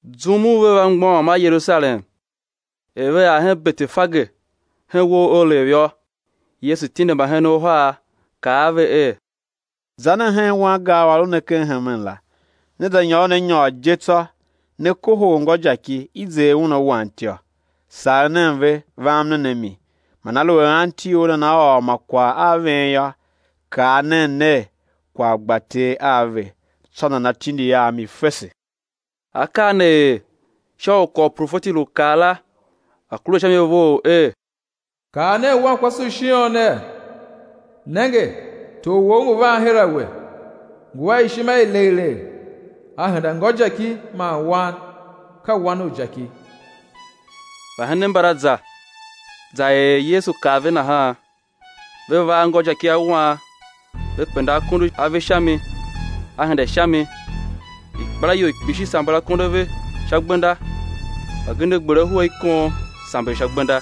Zum u ve va ngbôghom a Yerusalem er ve ar hen Betefage hen uwo u Olev yô, Yesu tindi mbahenen uhar, kaa a ve er: Za nen hen wangar u a lu ne ken hemen la; né za nyôron a nyôr je tsô, né kohol ngôjaki i zer un, a wan ityô. Sagh nen ve, vam nen a mi. Man aluer anti or nana ôr ma kwagh a ven yô, kaa nen ner: Kwagh gba Ter a ve: tsô nana tindi a mi fese. Akaa ne er sha u kwagh u profeti lu kaa la a̱ kure sha mi vough er: Kaa nen wankwase u Shion ner: Nenge, Tor wou ngu van her a we, ngu a ishima i legh legh, a henda ngôjaki man wan, ka wan u jaki. Mbahenen mbala za, za er er Yesu kaa ve nahan. Ve va a ngôjaki a wan, ve penda akondo a ve sha mi; A henda sha mi. Ikpelaior i kpishi samber akondo a ve sha gbenda, mbagenev gber ahu a ikon, samber sha gbenda.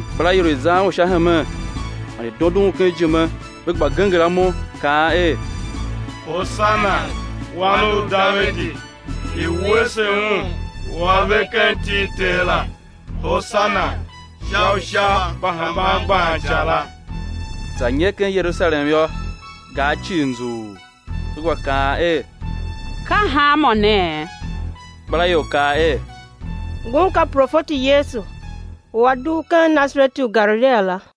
Ikpelaior i zan Un sha hemen man i dondon Un ken ijime, ve gba genger amo, kaan er: Hosana Wan u Davidi, i̱ wuese Un u A ve ken iti i Ter la; Hosana sha Usha mba hemban gban ica la. Za nyer ken Yerusalem yô, gar cii nzughul, ve gba kaan er: Ka hanmô ne? Ikpelaior kaa er: Ngun ka profeti Yesu, u A dugh ken Nasareti u ken Galilia la.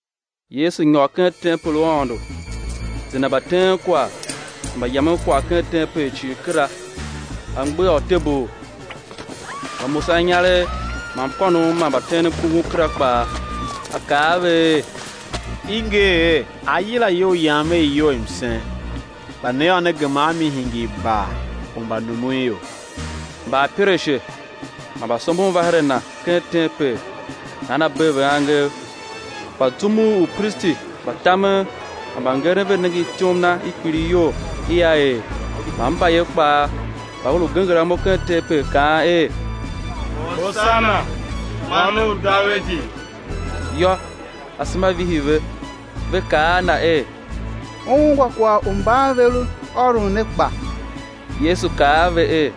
Yesu nyôr ken tempel u Aôndo, zenda mbateenkwagh man mbayamenkwagh ken tempel cii kera, A mgbegha utebul mba mbamusaninyaregh man mkônom ma mbateenmkungum kera kpaa. A kaa a ve er: I nger er: Á yila iyou Yam er iyou i msen; kpa ne yô, ne gema a mi, hingir bar u mbanumunior. Mbaapirashe man mbasombon va her a Na ken tempel nahan A bee ve angev. Kpa zum u upristi mba tamen man mbangeren ve nenge ityom Na i kpiligh iyol i A er, man mbayev kpaa mba ve lu genger amo ken tempel kaan er: Hosana Wan u Davidi, yô, asema vihi ve. Ve kaa a Na er: U ungwa kwagh u mban ve lu ôron ne kpa? Yesu kaa a ve er: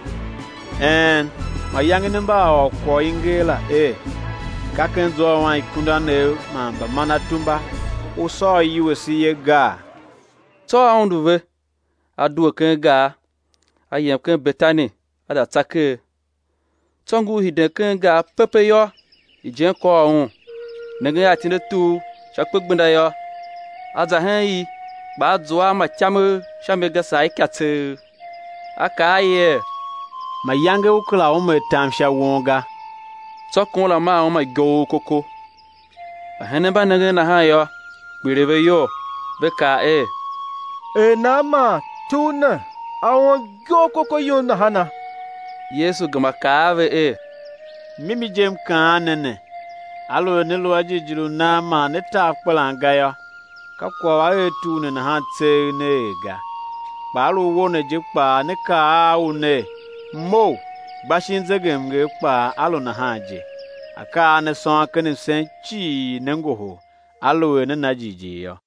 Een! Mayange ne mba a ôr kwagh u i nger la er: Ka ken zwa u anikundanev man mbamanatumba U sôr iwuese ye, gaa? Tsô A undu ve, A due ken gar, A yem ken Betani A za tsa ker. Tsô ngur hiden ken gar pepe yô, ijen kôr Un. Nengen a itine i tur sha kpegbenda yô, A za hen i kpa A zua a ma ityamegh sha mi ga saa ika tseegh; A kaa a i er: Mayange ú kera ume atam sha won ga. Tsô kon la maa uma gyoghokoko. Mbahenen mba nengen nahan yô, kpiligh ve iyol, ve kaa er: Er nan man tur ne a om gyoghokoko yum nahana? Yesu gema kaa a ve er: Mimi je M kaan ne, aluer ne lu a jighjigh u nan man né ta akpelan ga yô, ka kwagh u a er tur ne nahan tseegh né er ga, kpa á lu uwo ne je kpaa, né kaa u ner: Mough, gba shin zegemnger kpaa á lu nahan je. Akaa a ne sôn ken msen cii, né ngohol, aluer nea na jighjigh yô.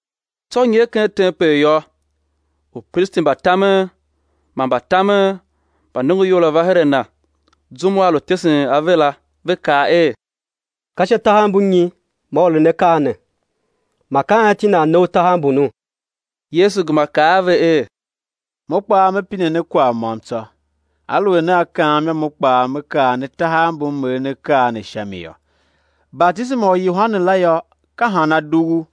Tsô nyer ken tempel yô, upristi mba tamen man mbatamen mba nongoior la va her a Na zum u A lu tesen ave la, ve kaa er: Ka sha tahav mbu nyi man U eren akaa ne? Man ka anti nan ne U tahav mbunu? Yesu gema kaa a ve er: Mo kpaa Me pine ne kwagh môm tsô, aluer nea kaam yô, Mo kpaa Me kaa ne tahav mbu M eren akaa ne sha mi yô. Batisema u Yohane la yô, ka han a dughu?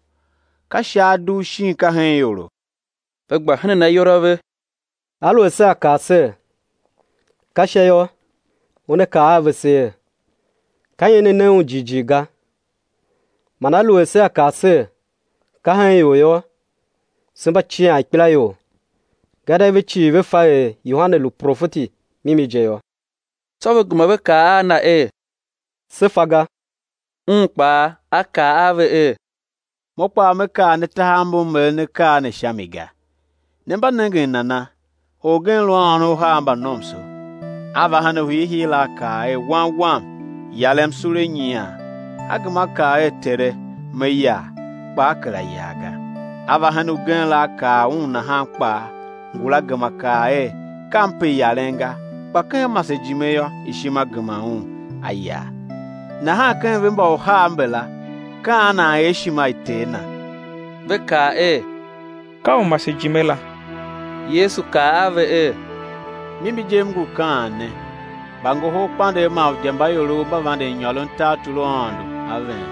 Ka Sha a dugh shin ka hen ioro? Ve gba henen ayol a ve er: Aluer sea kaa ser: Ka Sha yô, Una kaa a vese er: Ka nyi ne na un jighjigh ga? Man aluer sea kaa ser: Ka hen ior, yô, se mba cian ikpelaior, gadia ve cii ve fa er Yohane lu profeti mimi je yô. Tsô ve gema ve kaa a Na er: Se fa ga! Un kpaa A kaa a ve er: Mo kpaa Me kaa ne tahav mbu M eren akaa ne sha mi ga. Ne mba nengen nana? Orgen lu a ônov uhar mba nomso; a va hen u hiihii la, a kaa er: Wan wam, yarem sule nyian. A gema a kaa er: Tere, me yar; kpa a kera yar ga. A va hen ugen la a kaa un nahan kpaa. Ngula gema kaa er: Kam pe yaren ga. Kpa ken masejime yô, ishima gema un, a yar. Nahan ken ve̱ mba uhar mbala, ka an nan er ishima i ter na? Ve kaa er: Ka u masejime la. Yesu kaa a ve er: Mimi je, M ngu kaan ne, mbangoholkpandegh man udyambaiorov mba vanden nyôron tartor u Aôndo a ven.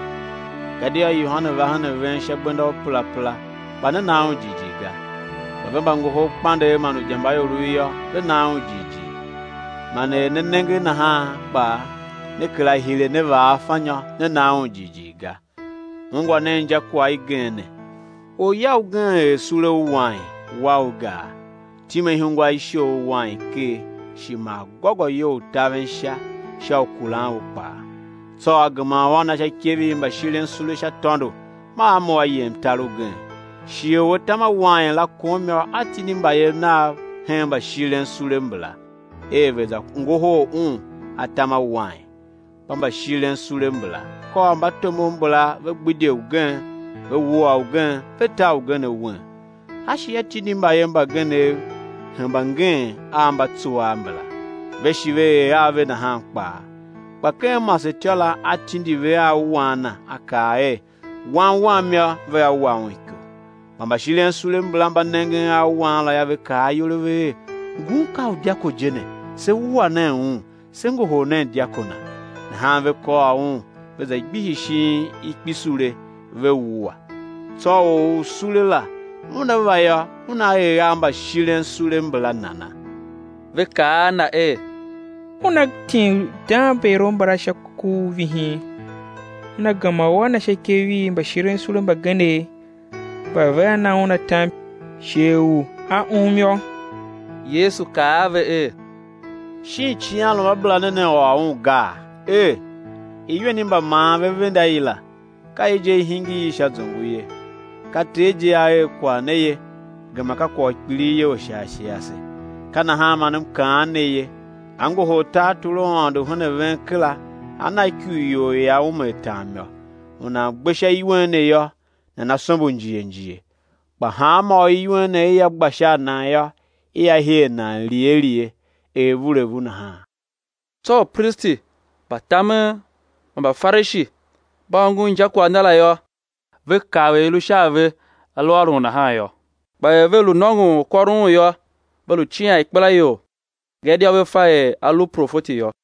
Gadia Yohane va hen a ven sha gbenda u perapera, kpa ne na un jighjigh ga; kpa ve mbangoholkpandegh man udyambaiorov yô, ve na un jighjigh; man er ne nenge nahan kpaa, ne kera hire ne vaa afanyô ne na un jighjigh ga. Ungwa nen injakwagh igen ne: Orya ugen er sule u wain, wa u gar, time ihungwa i shoghol wain ker, shi maa gôgôyou u taven sha sha u kuran u kpaa, tsô a gema u a na sha ikev i mbashirensule sha tôndo, maa a mough a yem tar ugen. Shighe u atam a wain la kom yô, a tindi mbayev nav hen mbashirensule mbala, er ve̱ za ngohol un atam a wain. Kpa mbashirensule mbala kôr mbatomov mbala ve gbidye ugen, ve wua ugen, ve ta ugen awen. A shi a tindi mbayev mbagenev hemba ngeen a mba tsuaa mbala; ve shi ve er a ve nahan kpaa. Kpa ken masetyô la, a tindi ve a wan na, a kaa er: Wan wam yô, vea wa un iko. Kpa mbashirensule mbala mba nengen a wan la yô, ve kaa ayol a ve er: Ngun ka u dyako je ne; se wua nen un, se ngohol nen dyako na. Nahan ve kôr un, ve za gbihi shin ikpisule, ve wua. Tsô or u sule la, una va yô, una er a mbashirensule mbala nana? Ve kaa a Na er: Una tim undangmbaiorov mbala sha ku u vihin, una gema u á na sha ikev i mbashirensule mbagenev mba vea na un atam sha shighe u a um yô. Yesu kaa a ve er: Shin icighanruamabera ne, ne ôr un gaa? Er: Iwen i mbamaan ve venda i la, ka i je, i hingir i sha zongo ye, ka Ter je A er kwagh ne ye, gema ka kwagh u kpilighyol sha ashe ase. Ka nahan man M kaan ne ye, á ngohol tartor u Aôndo hen a ven kera á na ikurior i ia ume atam yô. [ U nan gbe sha iwen ne yô, nana sombo njighe njighe; kpa hanmô u iwen ne ia gba sha a nan yô, ia her nan lighe lighe er vuulevu nahan.] Tsô upristi mba tamen man Mbafarishi mba ongo injakwagh Na la yô, ve kav er i lu sha a ve A lu ôron nahan yô. Kpa er ve lu nôngon u kôron Un yô, ve lu cian ikpelaior, gadia ve fa er A lu profeti yô.